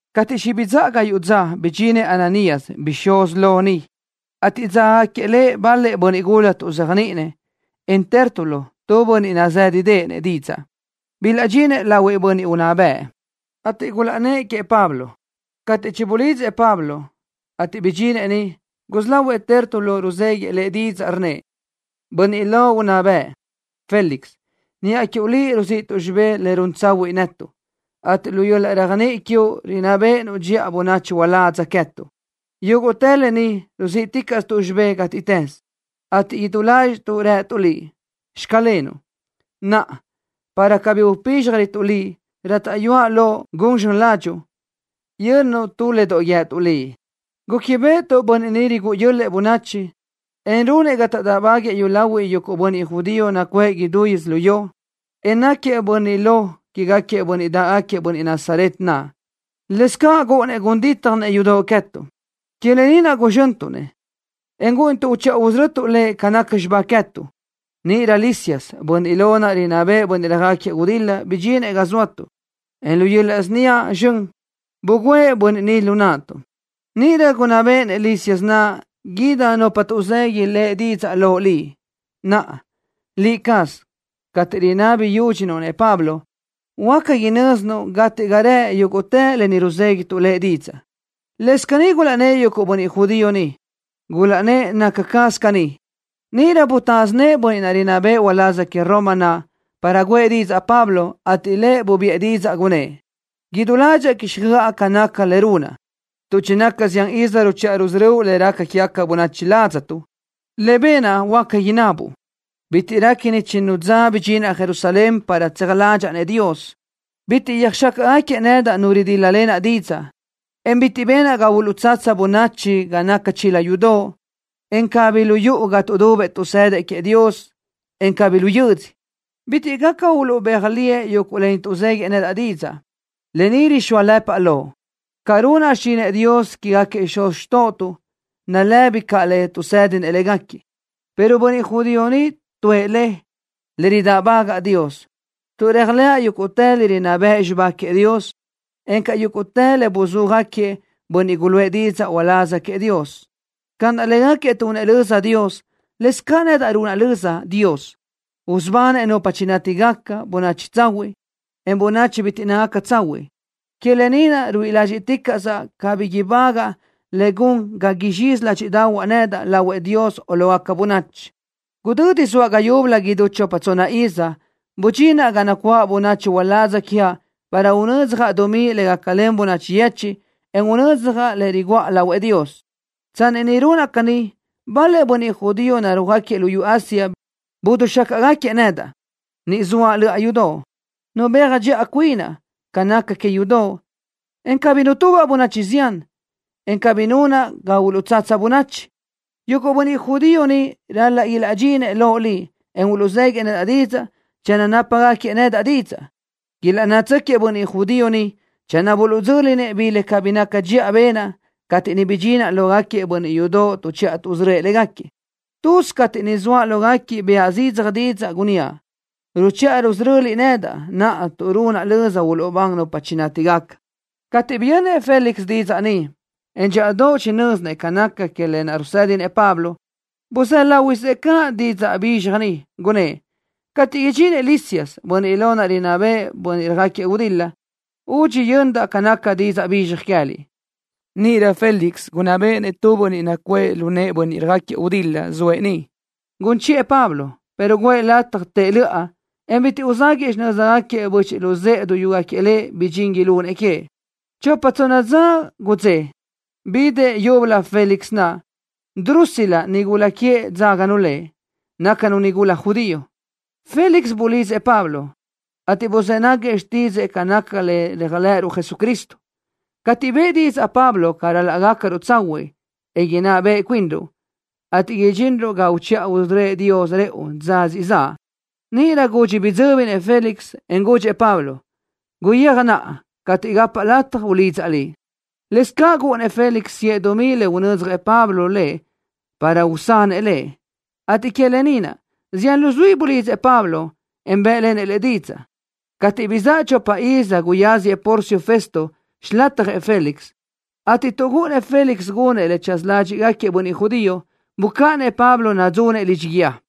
Cateʼ chibizáʼa gayuʼ dza, bidxinëʼ Ananías, bixúz lo, niʼ, ateʼ dzágagaquiëʼ lëʼ bal-lëʼ bönniʼ gula tuʼzéajniʼinëʼ, en Tértulo, tu bönniʼ nazë́ʼedeʼenëʼ didzaʼ. Bilaʼdxinëʼ lahuëʼ bönniʼ unná bëʼ, ateʼ gulaʼnnë́ʼ queëʼ Pablo. Cateʼ chibuluʼlidzëʼ Pablo, ateʼ bidxinëʼ niʼ, gusí lahuëʼ Tértulo ruzéguiʼë lëʼ didzaʼ, rnnëʼ: —Bönniʼ lo unná bëʼ, Félix. Niʼa quiuʼ liʼ ruziʼtuʼ xibé le run tsahuiʼ netuʼ, ateʼ lu yöl-laʼ réajniʼi quiuʼ rinná béʼenuʼ dxiʼa bönachi uládz queë́tuʼ. Yúguʼtë lë ni ruzíʼticaʼstuʼ xibé gátiʼtës, ateʼ idú ládxiʼtuʼ rëtuʼ liʼ: “Xclenuʼ.” Naʼa, para cabí upízxjarötuʼ liʼ, rátaʼyuaʼ loʼ gun zxön ládxuʼu, yönnuʼ tu le doʼ guíëtuʼ liʼ. Gúquibeʼetuʼ bönniʼ ni rigúʼu yö́l-lëʼë bönachi, en runëʼ ga taʼdáʼbaguëʼë yúlahuiʼ yuguʼ bönniʼ judío nacuʼë idútë yödzölió, en náquiëʼ bönniʼ lo quégaquiëʼ bönniʼ dáʼgaquiëʼ bönniʼ Nazaret naʼ. Lëscaʼ gúʼunnëʼ gun dítjanëʼ yudoʼ queë́tuʼ. Que lë ni naʼ guzxöntuʼ-nëʼ, en gúʼunituʼ uchiʼa usörötuʼ lëʼ ca naca xibá queë́tuʼ. Níʼirö Lisias, bönniʼ lo rinná béʼenëʼ bönniʼ röjáquiëʼ gudil-la bidxinëʼ ga zóatuʼ, en lu yöl-laʼ síniaʼ zxön bugǘëʼ bönniʼ ni lu naʼtuʼ. Níʼirö gunná béʼenëʼ Lisias naʼ ídigaca nupa tuʼzegui lëʼ didzaʼ loʼ liʼ. Naʼa, liʼ caz, cateʼ rinabi yúdxinuʼ-nëʼ Pablo ni, huáca inö́zinuʼ gate ga rëʼ yúguʼtë lë ni ruzéguituʼ lëʼ didzaʼ. Lëscaʼ caní gulaʼnnë́ʼ yuguʼ bönniʼ judío niʼ, gulaʼnnë́ʼ naca caz caní. Níʼirö butásö nëʼë bönniʼ rinná bëʼë uláz que Roma naʼ para guʼë didzaʼ Pablo, ateʼ lëʼ bubiʼë didzaʼ, gunnë́ʼ: —Idú ládxaʼa quíxjöʼa ca naca le runaʼ, tuʼ chinaca zián iz ruchiʼa rusörö́uʼ le raca quégaca bönachi ladztuʼ. Le benaʼ huáca inabuʼ. Bitiʼ réquini chinnu dza bidxinaʼ Jerusalén para tseaj ládxaʼa-nëʼ Dios. Bitiʼ yöjxácaʼgaquiëʼ nedaʼ nu ridíl-lalenaʼ didzaʼ, en bitiʼ benaʼ ga uluʼtsatsa bönachi ga naca chila yudoʼ, en cabí lu yuʼu ga tuʼdubëʼ tuʼsëdëʼ queëʼ Dios, en cabí lu yödzö. Bitiʼ caʼ gaca uluʼbéaj liëʼ yuguʼ lë ni tuʼzéguiëʼ nedaʼ didzaʼ. Lë ni rixóalëpaʼ loʼ. Ca runaʼ xichinëʼ Dios quégaquiëʼ xuz xtóʼotuʼ nalëbi ca le tuʼsë́dinëʼ légaquiëʼ, pero bönniʼ judío ni tuʼë le: Le ridáʼbagaʼ Dios, tuʼ réajlëʼa yúguʼtë le rinná bëʼ xibá queëʼ Dios, encaʼ yúguʼtë le buluʼzúajëʼ bönniʼ guluʼë didzaʼ uláz queëʼ Dios. Ca naʼ légaquiëʼ tunëʼ löza Dios, lëscaʼ nedaʼ runaʼ löza Dios, usubanëʼ nupa chinátigaca, bönachi tsahuiʼ, en bönachi bitiʼ nácagaca tsahuiʼ. Que lë ni naʼ ruíʼi ládxiʼticaʼsaʼ cabí ibágaʼa le gun ga uxö́s ládxiʼdaʼahuaʼ nedaʼ lahuëʼ Dios o lógaca bönachi. ’Gudödi zoaʼ ga yúbölö idú chopa tsonna iz, budxinaʼ ga nacuáʼ bönachi uládz quiaʼ para unödzjaʼ dumí le gácalen bönachi yechiʼ, en unödzjaʼ le riguʼa lahuëʼ Dios. Tsanni niʼ runaʼ caní, bal-lëʼ bönniʼ judío narúajgaquiëʼ luyú Asia bidixácaʼgaquiëʼ nedaʼ. Niʼ zoaʼ löʼa yudoʼ, nubéaj dxiʼa cuinaʼ ca naca que yudoʼ, en cabí nutubaʼ bönachi zián, en cabí nunaʼ ga uluʼtsatsa bönachi. Yuguʼ bönniʼ judío niʼ ral-laʼ ilaʼdxinëʼ loʼ liʼ, en uluʼzéguiëʼ nedaʼ didzaʼ channö nápagaquiëʼ nedaʼ didzaʼ. Ilaʼnnátsöquiëʼ bönniʼ judío ni channö buluʼdzö́linëʼ bi le cabí naca dxiʼa benaʼ cateʼ niʼ bidxinaʼ lógaquiëʼ bönniʼ yudoʼ tuʼchiʼa tuʼsörö́ëʼ légaquiëʼ. Tuz cateʼ niʼ zoaʼ lógaquiëʼ, bëʼa zidzaj didzaʼ, gunníaʼ: “Ruchiʼa rusöröliʼ nedaʼ naʼa tuʼ runaʼ löza uluʼbán nupa chinátigaca.” Cateʼ biyönnëʼ Félix didzaʼ ni, en dxíʼadoʼ chinö́zinëʼ ca naca que lë naʼ rusë́dinëʼ Pablo, buzë́ láhuiʼsëʼ caʼ didzaʼ bizxaj ni, gunnë́ʼ: —Catiʼ idxinëʼ Lisias, bönniʼ lo rinná béʼenëʼ bönniʼ röjáquiëʼ gudil-la, údxi yö́nidaʼ ca naca didzaʼ bizxaj queë́liʼ. Níʼirö Félix gunná béʼenëʼ tu bönniʼ nacuʼë lu nëʼë bönniʼ röjáquiëʼ gudil-la zoëʼ niʼ, gun chiʼë Pablo, pero guʼë lëʼ lataj tëʼ löʼa, en bitiʼ uzáguëʼë xinö́zgaquiëʼ böchiʼ luzë́ʼë duyúgaquiëʼ lëʼ bi dxin ilunëʼ queëʼ. Chopa tsonna dza gudzé, bidëʼ leyúbölö Félix naʼ. Drusila, nigula queëʼ dzáganu lëʼ. Nácanu nigula judío. Félix bulidzëʼ Pablo, ateʼ buzë́ náguiëʼ xtídzëʼë ca naca le réajlëʼëruʼ Jesucristo. Cateʼ bëʼë didzaʼ Pablo ca ral-laʼ gácaruʼ tsahuiʼ, en inná beʼe cuinruʼ, ateʼ idxinruʼ ga uchiʼa usörö́ëʼ Dios rëʼu dza siʼ zaʼ, níʼirö gudxi bidzö́binëʼ Félix, en gudxëʼ Pablo: —Guyéaj naʼa. Cateʼ gapaʼ lataj ulidzaʼ liʼ. Lëscaʼ gúʼunnëʼ Félix siʼë dumí le unödzjëʼ Pablo lëʼ para usanëʼ lëʼ, ateʼ que lë ni naʼ, zián luzuí bulidzëʼ Pablo, en bë́ʼlenëʼ lëʼ didzaʼ. Cateʼ bizáʼa chopa iz guyáziëʼ Porcio Festo xilatjëʼ Félix, ateʼ tuʼ gúʼunnëʼ Félix gunëʼ le tsaza ládxiʼgaquiëʼ bönniʼ judío, bucáʼanëʼ Pablo nadzunëʼ lidxi guíë.